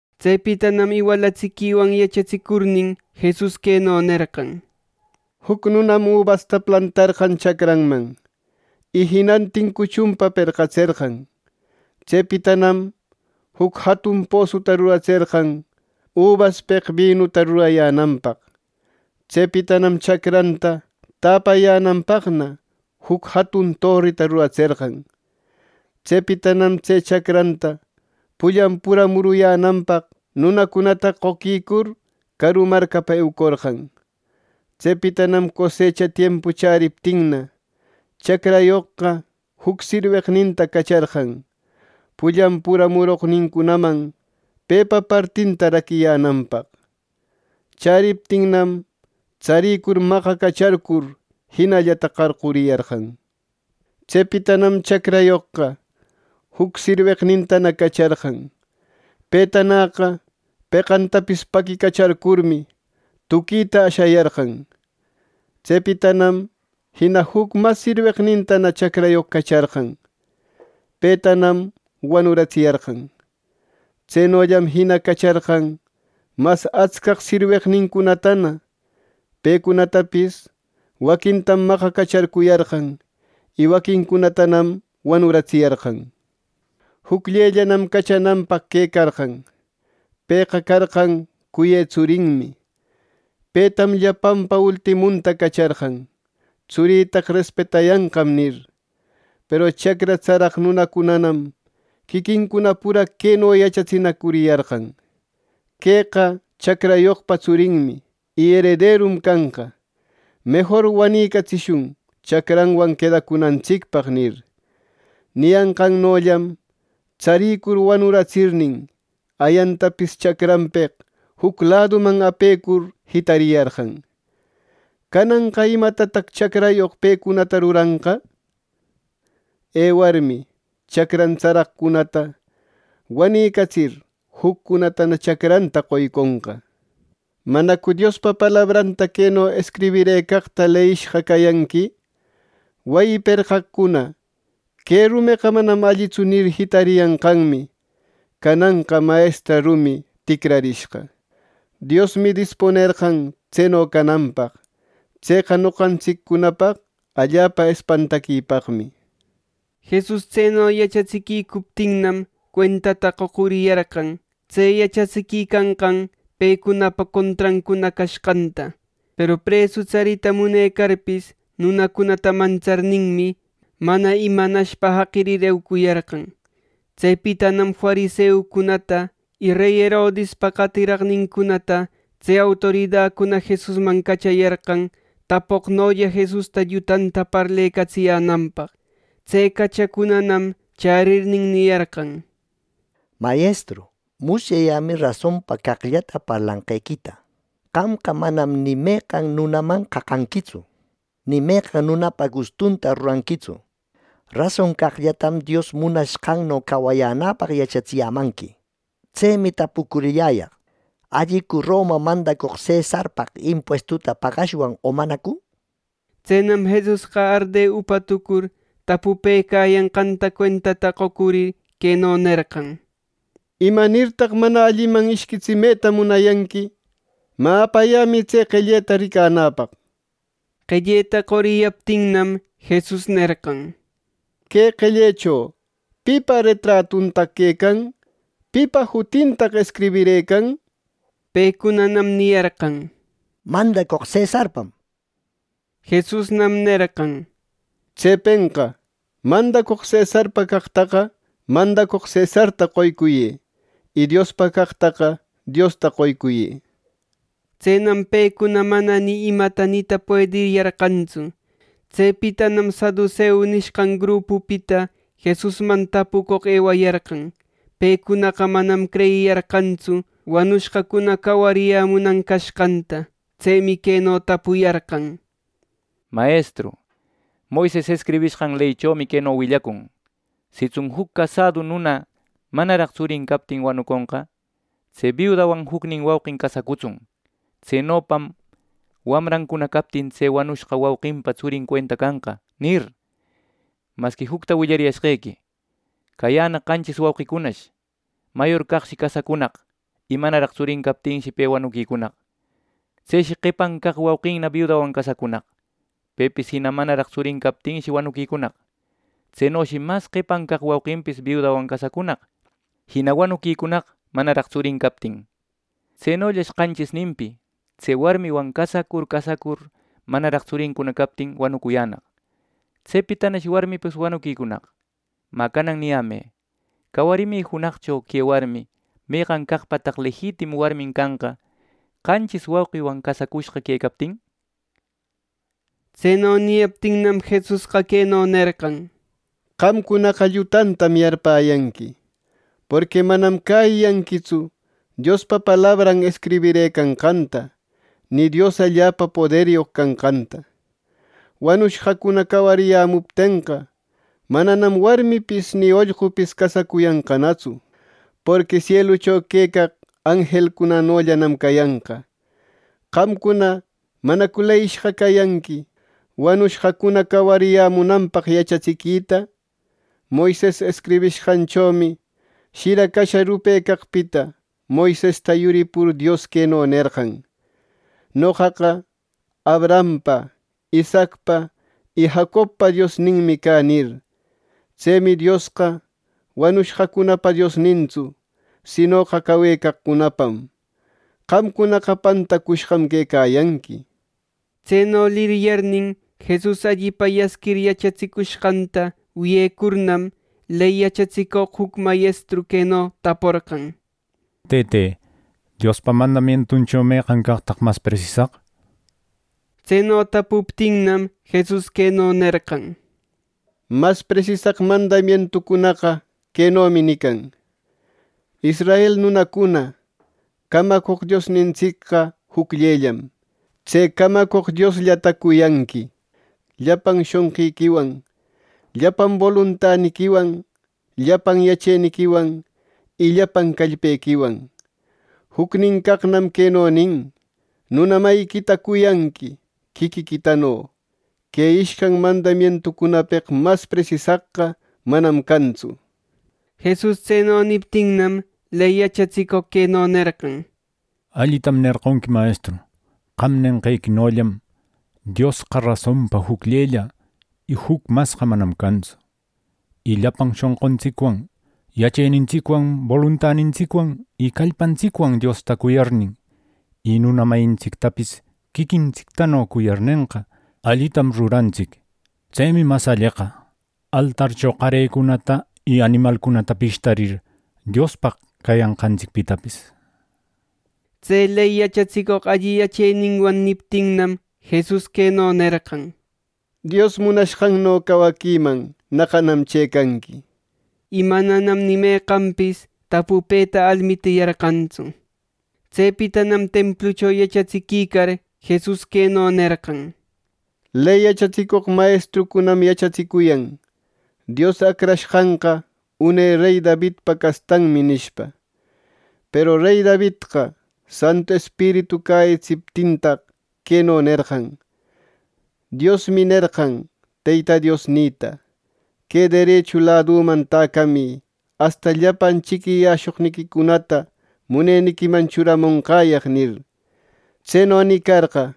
Tsepitanam iwalatsiquiwan yachatsicurnin, Jesus queno nerqan: “Juc nunam ubasta plantarqan chacranman, y jinantin cuchunpa perqatserqan. Tsepitanam juc jatun posuta ruratserqan ubaspeq binuta rurayänanpaq. Tsepitanam chacranta täpayänanpaqna juc jatun torita ruratserqan. Tsepitanam tse chacranta pullan pura muruyänanpaq nunacunata qoquicur, caru marcapa eucorqan. Tsepitanam cosecha tiempu chäriptinna, chacrayoqqa juc sirweqninta cacharqan, pullan pura muroqnincunaman pepa partinta raquiyänanpaq. Chäriptinnam, tsaricur maqacacharcur jinallata qarquriyarqan. Tsepitanam chacrayoqqa juc sirweqnintana cacharqan. Petanäqa peqantapis paquicacharcurmi, tuquita ashayarqan. Tsepitanam jina juc mas sirweqnintana chacrayoq cacharqan. Petanam wanuratsiyarqan. Tsenollam jina cacharqan mas atscaq sirweqnincunatana. Pecunatapis waquintam maqacacharcuyarqan; y waquincunatanam wanuratsiyarqan. “Jucllellanam cachananpaq quecarqan. Pëqa carqan cuyë tsurinmi. Petam llapanpa ultimunta cacharqan, ‘Tsurïtaqa respetayanqam’ nir. Peru chacra tsaraq nunacunanam quiquincuna pura queno yachatsinacuriyarqan: ‘Queqa chacrayoqpa tsurinmi y erederum canqa; mejor wanicatsishun chacranwan quedacunantsicpaq’ nir. Niyanqannollam tsarïcur wanuratsirnin, ayantapis chacranpeq juc laduman apecur jitariyarqan. “Cananqa ¿imatataq chacrayoq pecunata ruranqa? Ewarmi, chacran tsaraqcunata wanicatsir, juccunatana chacranta qoyconqa. ¿Manacu Diospa palabranta queno escribirëcaqta leyishqa cayanqui? ‘Wayi perqaqcuna: “Que rumeqa manam allitsu” nir, jitariyanqanmi, cananqa mayestra rumi ticrarishqa. Diosmi dispunerqan tseno cananpaq. Tseqa noqantsiccunapaq allapa espantaquipaqmi.’” Jesus tseno yachatsicuptinmi, cuentata qocuriyarqan, tse yachatsiquicanqan pecunapa contrancuna cashqanta. Peru presu tsarita munecarpis, nunacunata mantsarninmi, mana imanashpa jaqirir eucuyarqan. Tsepitanam fariseucunata y rey Herodispa qatiraqnincunata tse autoridacuna Jesusman cachayarqan, tapucoqnolla Jesusta llutanta parlecatsiyänanpaq. Tse cachacunanam chärirnin niyarqan: —Mayestru, musyayämi rasonpa caqllata parlanqequita. Qamqa manam ni meqan nunaman qaqanquitsu, ni meqan nunapa gustunta ruranquitsu. Rason caqllatam Dios munashqanno cawayänäpaq yachatsiyämanqui. Tsemi tapucurilläyaq: ¿Allicu Roma mandacoq cesarpaq impuestuta pagashwan o manacu? Tsenam Jesusqa arde upa tucur tapupëcayanqanta cuentata qocurir queno nerqan: —¿Imanirtaq mana alliman ishquitsimeta munayanqui! Mä, apayämï tse qelleta ricanäpaq. Qelleta qoriyaptinnam Jesus nerqan: —Que qellecho ¿pipa retratuntaq quecan? ¿Pipa jutintaq escribirëcan? Pecunanam niyarqan: —Mandacoq cesarpam —nir. Jesusnam nerqan: —Tsepenqa mandacoq cesarpa caqtaqa mandacoq cesarta qoycuyë; y Diospa caqtaqa Diosta qoycuyë —nir. Tsenam pecuna mana ni ima nita puediyarqantsu. Tsepitanam saduseu nishqan grupupita Jesusman tapucoq ewayarqan. Pecunaqa manam creyiyarqantsu wanushqacuna cawariyämunan cashqanta. Tsemi queno tapuyarqan: —Mayestru, Moises escribishqan leychomi queno willacun: ‘Sitsun juc casädu nuna manaraq tsurin captin wanuconqa, tse biudanwan jucnin wauqin casacutsun. Tsenopam wamrancuna captin tse wanucushqa wauqinpa tsurin cuenta canqa’, nir. Masqui jucta willariyashqequi: Cayänaq qanchis wauqicunash. Mayor caqshi casacunaq, y manaraq tsurin captinshi pe wanuquicunaq. Tseshi qepan caq wauqinna biudanwan casacunaq. Pepis jina manaraq tsurin captinshi wanuquicunaq. Tsenoshi mas qepan caq wauqinpis biudawan casacunaq, jina wanucunaq manaraq tsurin captin. Tsenollash qanchisninpi tse warmiwan casacur casacur manaraq tsurincuna captin wanucuyänaq. Tsepitanash warmipis wanuquicunaq. Mä, canan niyämë: Cawarimi junaqcho que warmi ¿meqan caqpataq lejitimu warmin canqa, qanchis wauqiwan casacushqa quecaptin! —nir. Tseno niyaptinnam, Jesusqa queno nerqan: —¡Qamcunaqa llutantam yarpäyanqui, porqui manam cäyiyanquitsu Diospa palabran escribirëcanqanta, ni Dios allapa poderyoq canqanta! Wanushqacuna cawariyämuptenqa, mananam warmipis ni ollqupis casacuyanqanatsu. Porqui sielucho quecaq anjelcunanollanam cayanqa. Qamcuna ¿manacu leyishqa cayanqui wanushqacuna cawarimunanpaq yachatsiquita? Moises escribishqanchomi shira casha rupecaqpita Moisesta yuripur Dios queno nerqan: ‘Noqaqa Abrahampa, Isaacpa y Jacobpa Diosninmi cä’ nir. Tsemi Diosqa wanushqacunapa Diosnintsu; sinoqa cawecaqcunapam. ¡Qamcunaqa pantacushqam quecayanqui! Tseno liryarnin, Jesus allipa yasquir yachatsicushqanta wiyecurnam, ley yachatsicoq juc mayestru queno taporqan: —Tëte, Diospa mandamientucho ¿Meqan caqtaq mas presisaq? —nir. Tseno tapuptinnam, Jesus queno nerqan: —Mas presisaq mandamientucunaqa quenomi nican: ‘Israel nunacuna, camacoq Diosnintsicqa jucllellam. Tse camacoq Diosllata cuyanqui llapan shonqiquiwan, llapan boluntaniquiwan, llapan yacheniquiwan y llapan callpequiwan.’ Jucnin caqnam queno nin: ‘Nuna mayiquita cuyanqui quiquiquitano.’ Que ishcan mandamientucunapeq mas presisaqqa manam cantsu. Jesus tseno niptinnam, ley yachatsicoq queno nerqan: —Allitam nerqonqui, Mayestru. Qam nenqequinollam: Diosqa rasonpa jucllella. Y juc masqa manam cantsu. Y llapan shonquntsicwan, yachenintsicwan, boluntanintsicwan, callpantsicwan Diosta cuyarnin, y nuna mayintsictapis quiquintsictano cuyarnenqa, allitam rurantsic. Tsemi mas alleqa, altarcho qarecunata y animalcunata pishtarir Diospaq cayanqantsicpitapis. Tse ley yachatsicoq alli yacheninwan niptinnam, Jesus queno nerqan: —Dios munashqanno cawaquiman naqanam chëcanqui —nir. Y mananam ni meqanpis tapupeta almitiyarqantsu. Tsepitanam templucho yachatsiquicar Jesus queno nerqan: —Ley yachatsicoq mayestrucunam yachatsicuyan ‘Dios Acrashqanqa une rey Davidpa castanmi’ nishpa. Peru Davidqa Santu Espiritu cäyitsiptintaq, queno nerqan: ‘Diosmi nerqan Teyta Diosnïta: Que derechu ladüman täcamï asta llapan chiquiyäshoqniquicunata muneniquiman churamonqäyaq’ nir. Tseno nicarqa,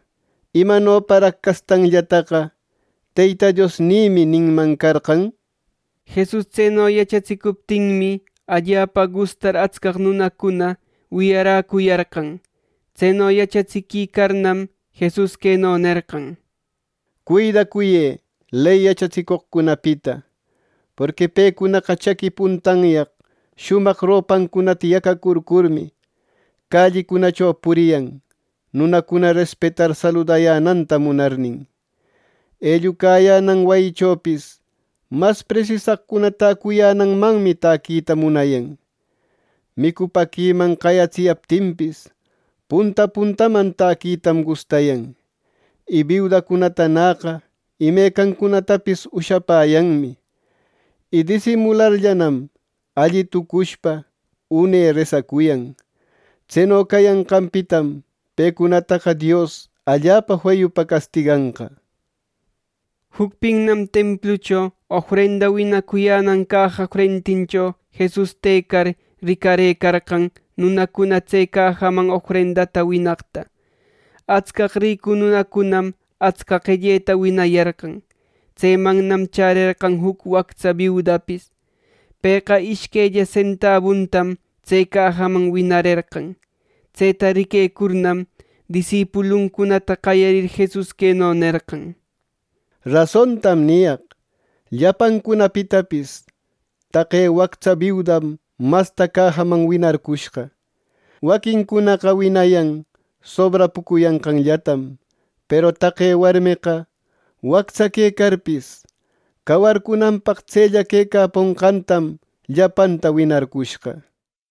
¡imanoparaq castanllataqa ‘Teyta Diosnïmi’ ninman carqan! Jesus tseno yachatsicuptinmi, allapa gustar atscaq nunacuna wiyaräcuyarqan. Tseno yachatsiquicarnam, Jesus queno nerqan: —Cuidacuyë ley yachatsicoqcunapita, porqui pecunaqa chaqui puntanyaq shumaq ropancunata yacacurcurmi, callicunacho puriyan, nunacuna respetar saludayänanta munarnin. Ellucayänan wayichopis mas presisaqcuna täcuyänanmanmi täquita munayan. Micupäquiman qayatsiyaptinpis, punta puntaman taquitam gustayan. Y biudacunatanäqa imecancunatapis ushapäyanmi. Y disimularllanam, alli tucushpa une resacuyan. Tseno cayanqanpitam pecunataqa Dios allapa feyupa castiganqa. Jucpinnam templucho ofrenda winacuyänan caja frentincho Jesus tëcar, ricarëcarqan nunacuna tse cajaman ofrendata winaqta. Atscaq ricu nunacunam atsca qelleta winayarqan. Tsemannam chärerqan juc wactsa biudapis. Pëqa ishquella sentabuntam tse cajaman winarerqan. Tseta riquecurnam, disipuluncunata qayarir Jesus queno nerqan: —Rasontam niyaq: Llapancunapitapis taqe wactsa biudam masta cajaman winarcushqa. Waquincunaqa winayan sobrapucuyanqanllatam; peru taqe warmeqa wactsa quecarpis cawarcunanpaq tsella quecaponqantam llapanta winarcushqa.